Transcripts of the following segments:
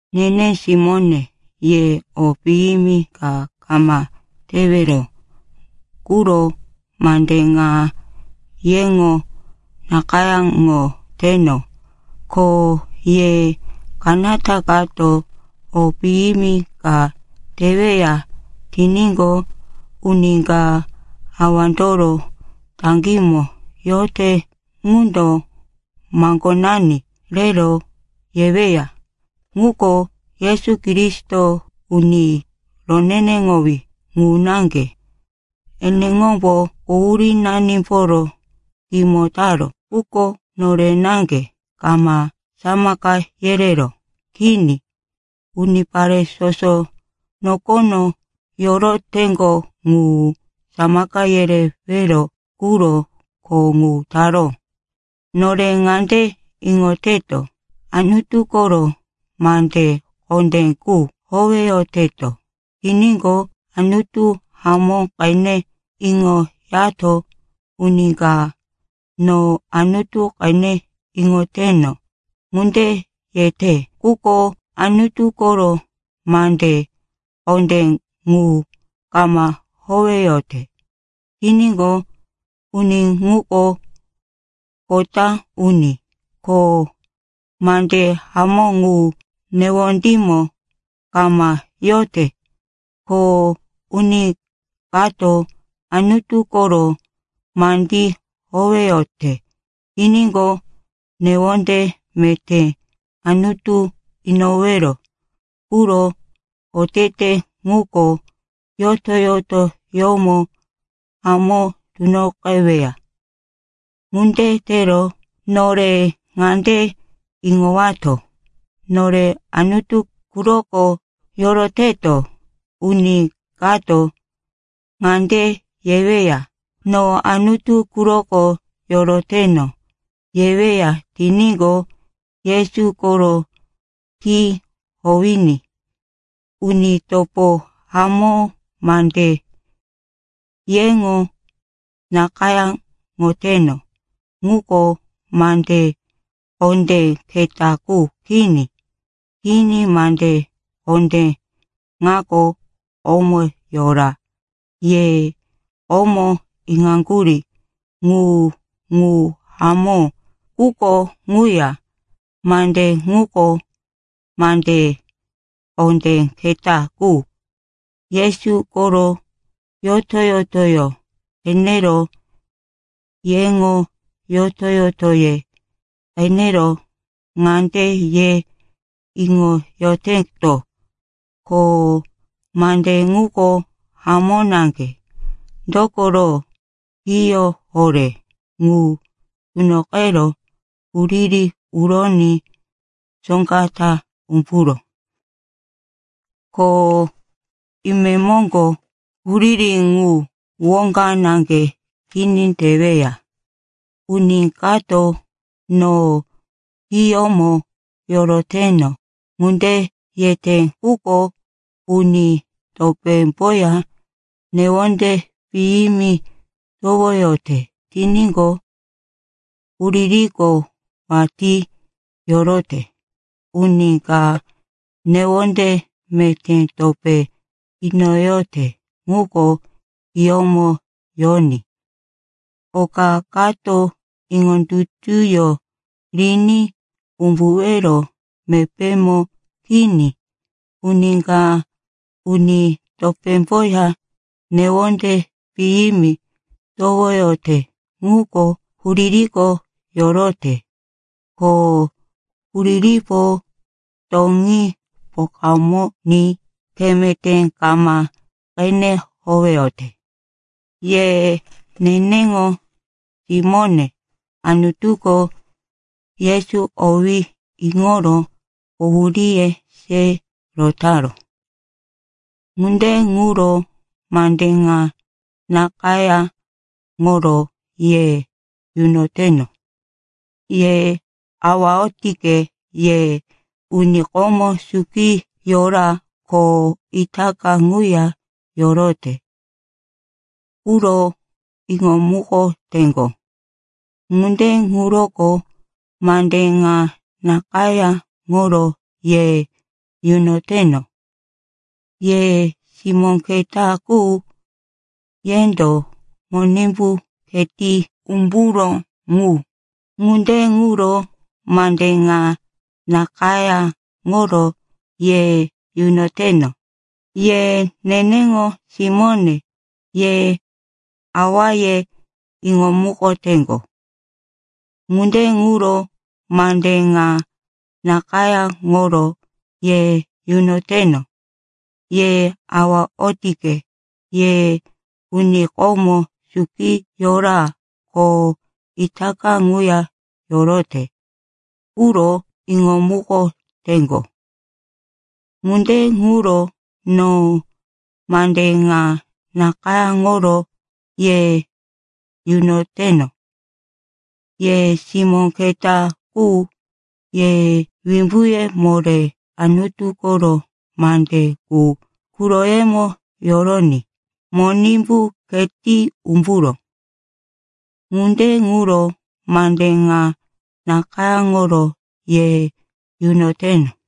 Nene simóne, ye o piyimi ka kama tewero quro mande ŋa yeŋo nakayáŋoteno. Ko ye kanata kato o piyimi ka teweya tiníqo, uni ka Awandoro taŋgímo yote ŋundo maŋgonani rero yeweya. Ŋuko Yesu Kristo, Uni Roneneŋowí ŋu naŋge. Eneŋombo quhurínanimboro kimo taró. Quko nore naŋge kama samaka yereró. Kini, unipare soso nokono yoroteŋgo ŋu samaka yerewero quro kho ŋu taró. Nore ŋande iŋoteto, Anutu koro mande kondé qu howeyoteto tiníqo, Anutu hamó qene iŋoyato. Uni ka, “No Anutu qene iŋoteno,” ŋunde yete, quko Anutu koro mande kondé ŋu kama howeyote tiníqo, uni ŋuko kota uni, ko mande hamó ŋu newondímo kama yote. Ko uni kato Anutu koro mandí howeyote tiníqo, newonde meté Anutu inowero quro otete ŋuko yoto-yotoyómo hamó tunoqeweya. Ŋunde tero nore ŋande iŋowato, nore Anutu quroko yoroteto. Uni kato ŋande yeweya, “No Anutu quroko yoroteno,” yeweya tiníqo, Yesu koro khí howiní. Uni topo hamó, mande yeŋo nakayáŋoteno, ŋuko mande kondé keta qu kini. Kini, mande kondé ŋako komo yora, ye komo iŋaŋgurí ŋu. Ŋu hamó, quko ŋuya mande ŋuko mande kondé keta qu. Yesu koro yoto-yotoyó qenero yeŋo yoto-yotoye qenero ŋande ye iŋoyoteto, ko mande ŋuko hamó naŋge. Dokoro hiyó horé ŋu tunoqero huriri uroní soŋga ta umburó. Ko imemoŋgo huriri ŋu woŋga naŋge kini teweya. Uni kato, “No hiyómo yoroteno,” ŋunde yete, quko uni topémboya newonde piyimi towoyote tiníqo, huririko watí yorote. Uni ka newonde meté topé inoyote ŋuko hiyómo yoní oka kato iŋondutuyó riní umbuwero mepémo kini. Uni ka uni topémboya newonde piyimi towoyote ŋuko huririko yorote. Ko huriripo toŋí pokamoní khe meté kama qene howeyote. Ye neneŋo simóne, Anutuko Yesu owí iŋoro quhuríye se rotaró. Ŋunde ŋuro mande ŋa nakayáŋoro ye yunoteno. Ye awa otike, ye uni komo suki yora ko itaka ŋuya yorote quro iŋomukoteŋgo. Ŋunde ŋuroko mande ŋa nakayáŋoro ye yunoteno. Ye simó keta qu, yendo Monimbu kheti umburó ŋu. Ŋunde ŋuro mande ŋa nakayáŋoro ye yunoteno. Ye neneŋo simóne, ye Awaye iŋomukoteŋgo. Ŋunde ŋuro mande ŋa nakayáŋoro ye yunoteno. Ye awa otike, ye uni komo suki yora ko itaka ŋuya yorote quro iŋomukoteŋgo. Ŋunde ŋuro no mande ŋa nakayáŋoro ye yunoteno. Ye simó keta qu, ye wimbuye moré, Anutu koro mande qu quroyemo yoroní Monimbu kheti umburó. Ŋunde ŋuro mande ŋa nakayáŋoro ye yunoteno.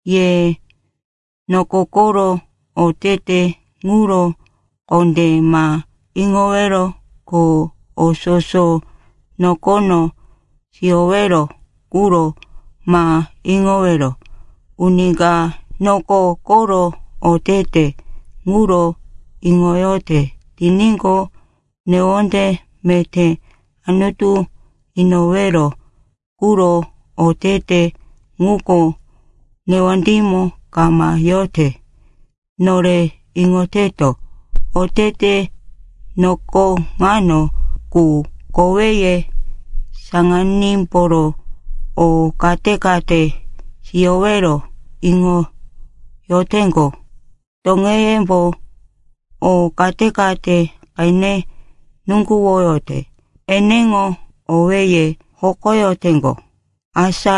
Ye noko koro otete ŋuro kondé ma iŋowero, ko o soso nokono siyowero quro ma iŋowero. Uni ka noko koro otete ŋuro iŋoyote tiníqo, newonde meté Anutu inowero quro otete ŋuko newondímo kama yote. Nore iŋoteto, otete noko ŋano qu: koweye saŋanímboro o kate-kate siyowero iŋoyoteŋgo, toŋeyembo o kate-kate qene nuŋguwoyote, eneŋo owéye hokoyoteŋgo; asa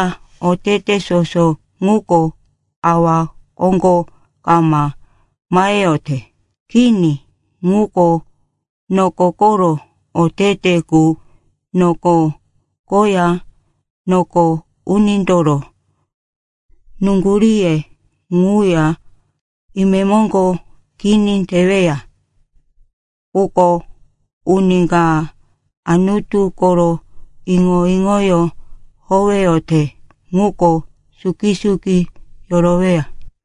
otete soso ŋuko Awa koŋgo kama maheyote. Kini, ŋuko noko koro otete qu. Noko koya noko unindoro nuŋguríye ŋuya imemoŋgo kini teweya. Quko uni ka Anutu koro iŋo-iŋoyó howeyote ŋuko suki-suki yoroweya.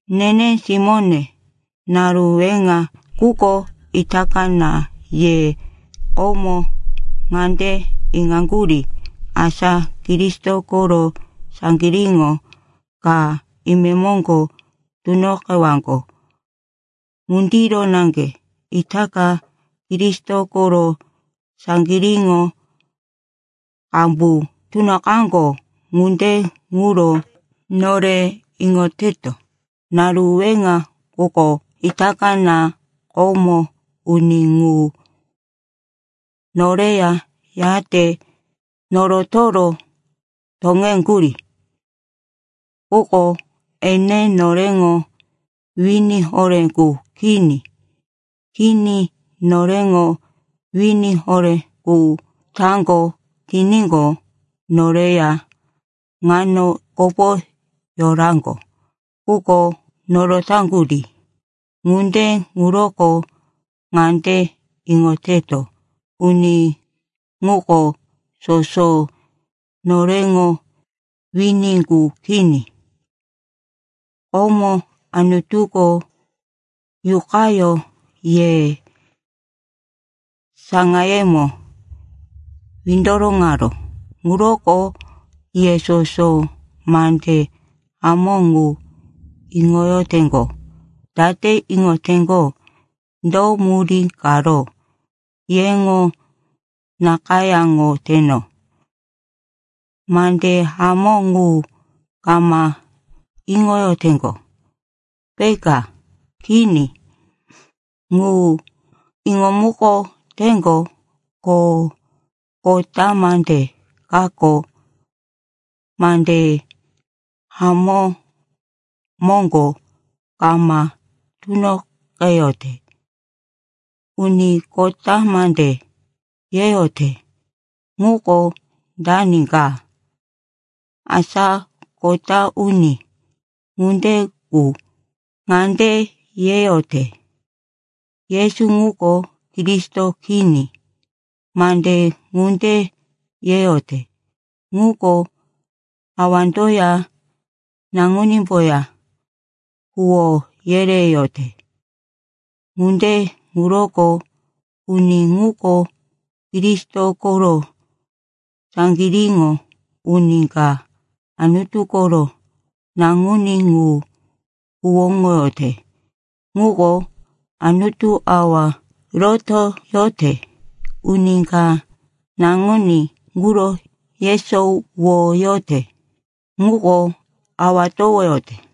Nene simóne, naru weŋa quko itaka na. Ye komo ŋande iŋaŋgurí, asa Kristo koro saŋgiríŋo ka imemoŋgo tunoqewaŋgo. Ŋundiro naŋge itaka Kristo koro saŋgiríŋo qambu tunoqaŋgo. Ŋunde ŋuro nore iŋoteto, naru weŋa quko itaka na. Komo uni ŋu noreya yate norotoro toŋeŋgurí. Quko ene noreŋo wini horé qu kini. Kini, noreŋo wini horé qu taŋgo tiníqo, noreya ŋano kopo yoraŋgo. Quko norotaŋgurí. Ŋunde ŋuroko ŋande iŋoteto, uni ŋuko soso noreŋo wini qu kini. Komo Anutuko Yuqayó ye saŋayemo windoroŋaró, ŋuroko ye soso mande hamó ŋu iŋoyoteŋgo. Date iŋoteŋgo, do murí karo yeŋo nakayáŋoteno? Mande hamó ŋu kama iŋoyoteŋgo, peka? Kini, ŋu iŋomukoteŋgo, ko kota mande kako mande hamó moŋgo kama tunoqeyote. Uni kota mande yeyote ŋuko dani ka? Asa kota uni ŋunde qu ŋande yeyote, “Yesu ŋuko Kristo kini.” Mande ŋunde yeyote ŋuko Awandoya Naŋunímboya huwó yereyote, ŋunde ŋuroko uni ŋuko Kristo koro saŋgiríŋo. Uni ka Anutu koro Naŋuní ŋu huwóŋoyote ŋuko Anutu Awa rotoyote. Uni ka Naŋuní ŋuro yesowoyote ŋuko Awa towoyote.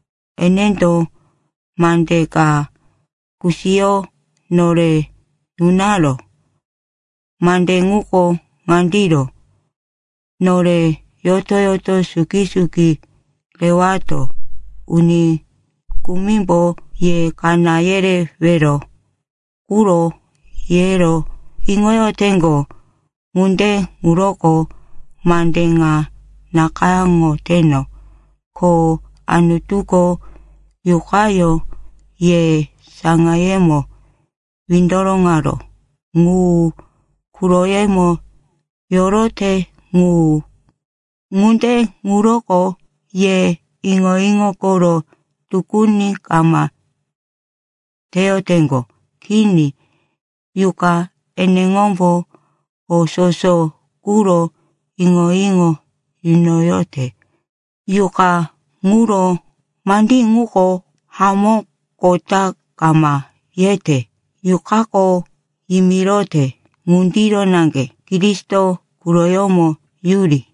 Enendo mande ka kusiyo nore nunaró, mande ŋuko ŋandiro: nore yoto-yoto suki-suki rewato. Uni kumimbo ye kaná yerewero quro yero iŋoyoteŋgo. Ŋunde ŋuroko mande ŋa nakayáŋoteno. Ko Anutuko Yuqayó ye saŋayemo windoroŋaró ŋu quroyemo yorote ŋu. Ŋunde ŋuroko ye iŋo-iŋo koro tukuni kama teyoteŋgo. Kini, Yuqa eneŋombo o soso quro iŋo-iŋo yunoyote. Yuqa ŋuro mandí ŋuko hamó, kota kama yete. Yuqako yimirote ŋundiro naŋge Kristo quroyómo yuri.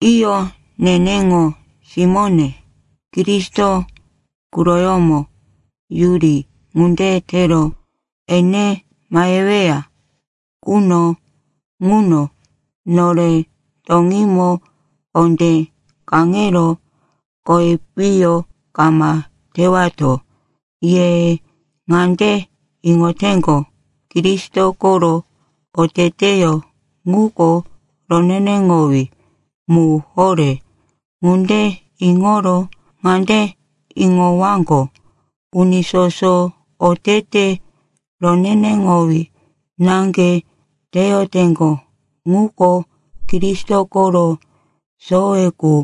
Iyo, neneŋo simóne, Kristo quroyómo yuri. Ŋunde tero ene maheweya quno ŋuno nore toŋímo kondé kaŋero kowi piyo kama tewato. Ye ŋande iŋoteŋgo, Kristo koro oteteyó ŋuko roneneŋowí mu horé. Ŋunde iŋoro ŋande iŋowaŋgo, uni soso otete roneneŋowí naŋge teyoteŋgo ŋuko Kristo koro sowe qu.